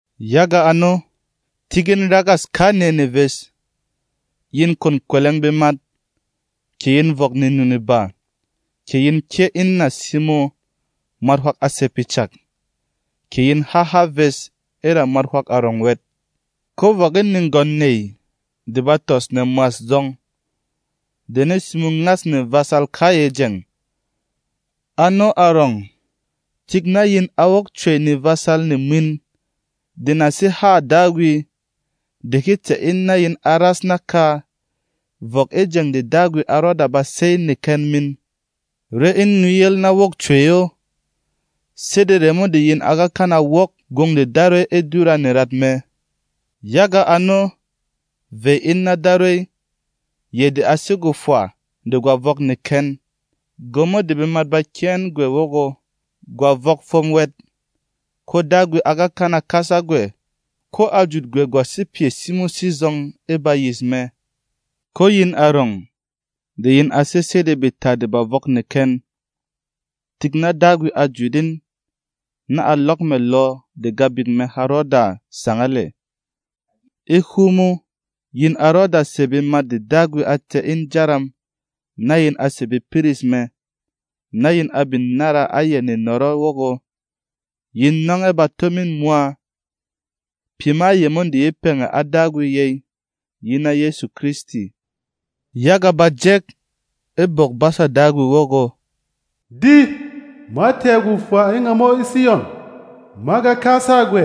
Yaga ano, tík in ragâs kanɛ neves. Yin kwon kwɛlɛng bemat, kɛ yin vɔk nenu-neba, kɛ yin kyɛ́ in nà simo mwat hwak a sɛ̀ pyɛ cak, kɛ yin ha há ves e ra mwat hwak arɔng wɛt. Ko vɔk in negwɔn nèy de ba tɔs nɛ mwas zɔng, de ne simo ngas nevasal kayɛ jeng. Ano arɔng, tik na yin a wok cwey nevasal ne mwin de na sé hâ Dagwi de he tɛ̀ in na yin a ras naka vɔk e jeng de Dagwi a rɔda ba sey neken min. Ré in nuyel na wok cwey o, sede remo de yin a ga kana wok gwong de Darwey e dura nerat mɛ. Yaga ano, vey in na Darwey, yɛ de a sé gwofwa de gwa vɔk neken, gwomo de bemat ba kyɛ́ ɛn gwɛ wɔgɔ, gwa vɔk fwom wɛt. Ko Dagwi a ga kana kasa gwɛ, ko a jut gwɛ gwa sé pyɛ simo sizɔng e bayis mɛ. Ko yin arɔng de yin a sé sede beta de ba vɔk neken, tik na Dagwi a jut in na a lɔk mɛ̀ lɔ de Gabik mɛ ha rɔda sangal ɛ̀. E hwomo, yin a rɔda sè bemat de Dagwi a tɛ̀ in jaram na yin a sè bepiris mɛ, na yin a bin nára a yɛ nenɔrɔ wɔgɔ, yin nɔng ɛ bato min mwa. Pyɛ ma yemo de ye pɛngɛ a Dagwi yey yi na Yɛsu Kristi. Yaga bà jɛk e Bwok-basa Dagwi wɔgɔ, “Di, ma tɛ̀ gwofwa e ngamo e Siyɔn: Ma ga kasa gwɛ,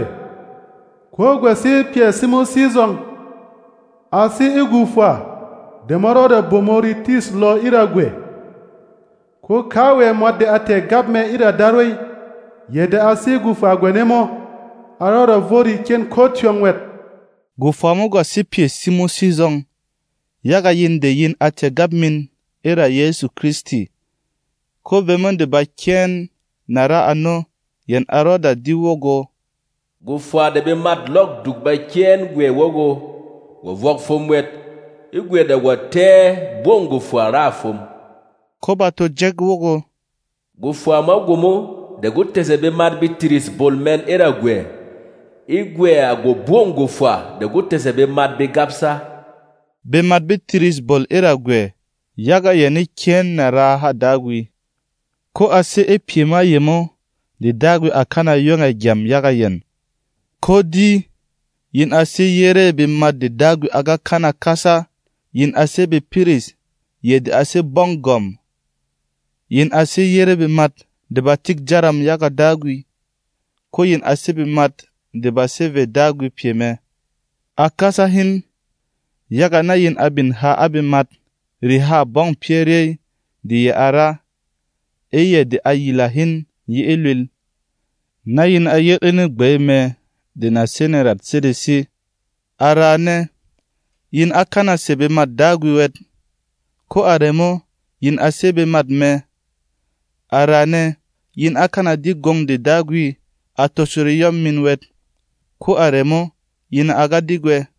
ko gwa sé pyɛ simo sizɔng; a sé e gwofwa de ma rɔda bomo retîs lɔ e ra gwɛ. Ko kawɛ mwat de a tɛ̀ gap mɛ e ra Darwey, yɛ de a sé gwofwa gwane mo, a rɔda vo rekyen ko tyɔng wɛt.” Gwofwa mo gwa sé pyɛ simo sizɔng yaga yin de yin a tɛ̀ gap min e ra Yɛsu Kristi, ko vemo de ba kyɛ́ ɛn nà ra ano yɛn a rɔda di wɔgɔ, “Gwofwa de bemât lɔk duk ba kyɛ́ ɛn gwɛ wɔgɔ, gwa vɔk fwom wɛt, e gwɛ de gwa tɛ́ ɛ gbɔng gwofwa râ fwom.” Ko bà to jɛk wɔgɔ, “Gwofwa ma gwomo de gwo tɛ̀sɛ bemat be tiris bol mɛn e ra gwɛ, e gwɛ à gwogbɔng gwofwa de gwo tɛ̀sɛ bemat be gabsa.” Bemat be tiris bol e ra gwɛ, yaga yɛn e kyɛ́ ɛn nà raa hâ Dagwi. Ko a sé e pyɛ ma yemo de Dagwi à kana yong ɛ̀ gyam yaga yɛn. Ko di, yin a sé yerê bemat de Dagwi a ga kana kasa; yin a sé bepiris, yɛ de a sé Gbɔng Gwɔ̀m; yin a sé yerê bemat de ba tik jaram yaga Dagwi; ko yin a sé bemat de ba sé vê Dagwi pyɛ mɛ. A kasa hin, yaga na yin a bin ha a bemat rehâ gbɔng pyɛ́ ryey de yɛ̀ a ra. E yɛ̀ de a yila hin yi e lwīl, na yin a yel e negbey mɛ de na sé nerat sedesi. A raane, yin á kana sè bemât Dagwi wɛt, ko a remo, yin a sé bemat mɛ. A raane, yin á kana di gwong de Dagwi a tosho reyɔm min wɛt, ko a remo, yin a ga di gwɛ.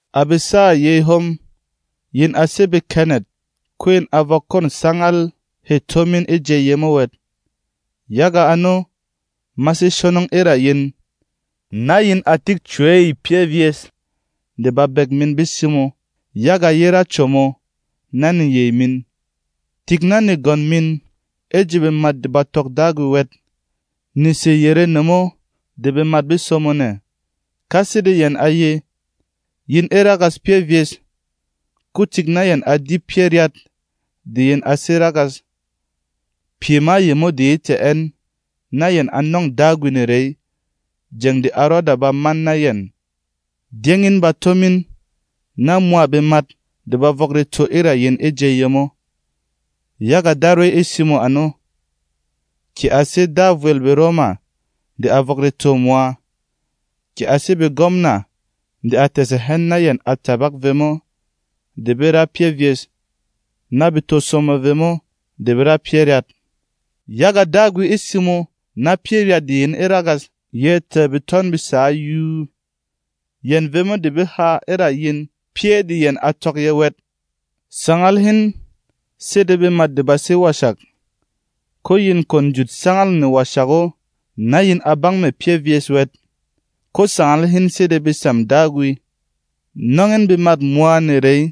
À besâ yey hom, yin a sé bekɛnɛt, ko yin a vɔk kwɔ̂n sangal hê tó min e jey yemo wɛt. Yaga ano, ma sé shonong e ra yin, na yin a tik cwey pyɛ́ vyes de babek min be simo yaga ye ra como na neyey min. Tik na negwɔn min e ji bemat de ba tɔk Dagwi wɛt ne sè yere nemo de bemat be somo nɛ. Ka sede yɛn a ye, yin e ragas pyɛ́ vyes, ko tik na yɛn a di pyɛ́ ryat de yin a sé ragas. Pyɛ ma yemo de yê tɛ̀ ɛn na yɛn a nɔ̂ng Dagwi nerey jeng de a rɔda ba man na yɛn. Dyɛ́ng in bato min na mwa bemat de ba vɔk reto e ra yin e jey yemo, yaga Darwey e simo ano, kɛ a sé Da vwel BeRoma de a vɔk retô mwa, kɛ a sé begwɔmna de a tɛ̀sɛ hɛn na yɛn a tabak vemo de be ra pyɛ́ vyes, na be to somo vemo de be ra pyɛ́ ryat. Yaga Dagwi e simo na pyɛ́ ryat de yin e ragas ye tɛ̀ betɔn be sǎ yuu, yɛn vemo de be ha e ra yin pyɛ́ de yɛn a tɔk yɛ̄ wɛt. Sangal hin sede bemat de ba sé washak. Ko yin kwon jut sangâl newashak o na yin a bang mɛ̀ pyɛ́ vyes wɛt. Ko sangal hin sede besam Dagwi. Nɔng in bemât mwa nerey,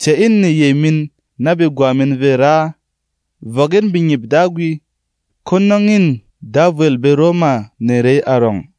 tɛ̀ in neyey min na begwa min vê raa, vɔk in bengyip Dagwi, ko nɔng în Da vwel BeRoma nerey arɔng.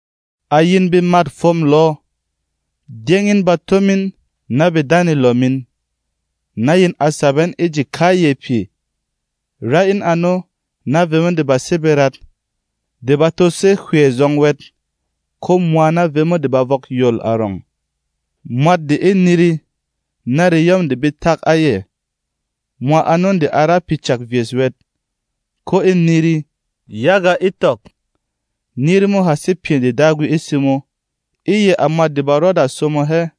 À yin bemât fwôm lɔ, dyɛ́ng in bato min na bedanelɔ min, na yin a sap ɛn e ji kayɛ pyɛ. Rá in ano na vemo de ba sé berat, de ba to sé hywɛ zɔng wɛt, ko mwa na vemo de ba vɔk yol arɔng. Mwat de e niri na reyɔm de be tak a yɛ, mwa ano de a ra pyɛ cak vyes wɛt, ko e niri, yaga e tɔk, niri mo ha sé pyɛ de Dagwi e simo — e yɛ à mwat de ba rɔda somo hɛ.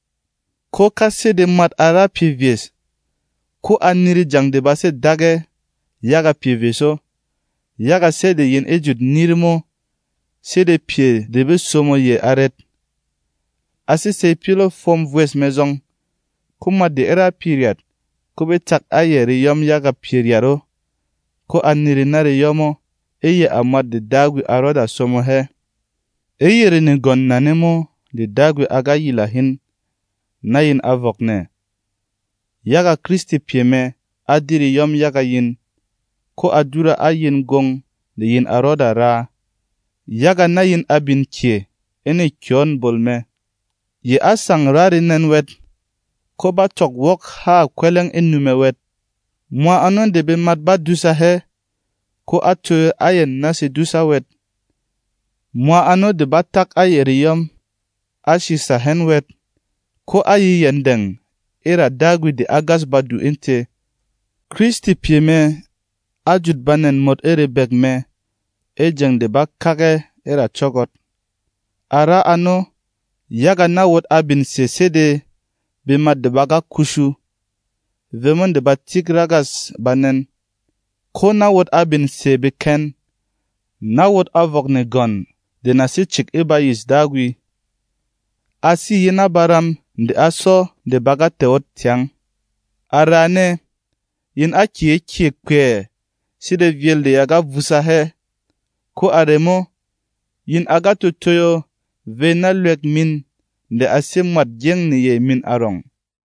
Ko ka sede mwat a ra pyɛ vyes, ko a niri jeng de ba sé dak ɛ yaga pyɛ vyes o, yaga sɛ́ de yin e jut niri mo sede pyɛ de bê somo yɛ arɛt? A sé sey pyɔlɔ̂ fwom vwes mɛ zɔng. Ko mwat de a ra pyɛ ryat, ko be tak a yɛ reyɔm yaga pyɛ ryat o, ko a niri na reyɔm o — e yɛ à mwat de Dagwi a rɔda somo hɛ. E yere negwɔn nane mo de Dagwi a ga yila hin, na yin a vɔk nɛ. Yaga Kristi pyɛ mɛ á di reyɔm yaga yin, ko a dura a yin gwong de yin a rɔda raa, yaga na yin a bin kyè e nekyɔ̌n bol mɛ. Yɛ á sang ra renɛn wɛt, ko bá tɔk wok hâ kwɛlɛng e nu mɛ wɛt. Mwa ano de bemat bá dùsa hɛ, ko á toyo a yɛn na sedusa wɛt. Mwa ano de bá tak a yɛ reyɔm, á shìsa hɛn wɛt, ko á ye yɛndɛng e ra Dagwi de e gas badu e tē. Kristi pyɛ mɛ á jut banɛn mot e rebek mɛ e jeng de bá kak ɛ e ra cɔ́gɔt. A ra ano, yaga na wot a bin sè sede bemat de ba ga kushu, vemo de ba tik ragâs banɛn, ko na wot a bin sè beken, na wot a vɔk negwɔn de na sé cik e bayîs Dagwi. A sé yi na baram de á sɔ de ba ga tɛ̀ ot tyang. A raane, yin á kyě kyè kpɛɛ sede vyēl de ya ga vusa hɛ, ko a remo, yin a ga to toyo vey na Lwek min de a sé Mwât Gyeng neyey min arɔng.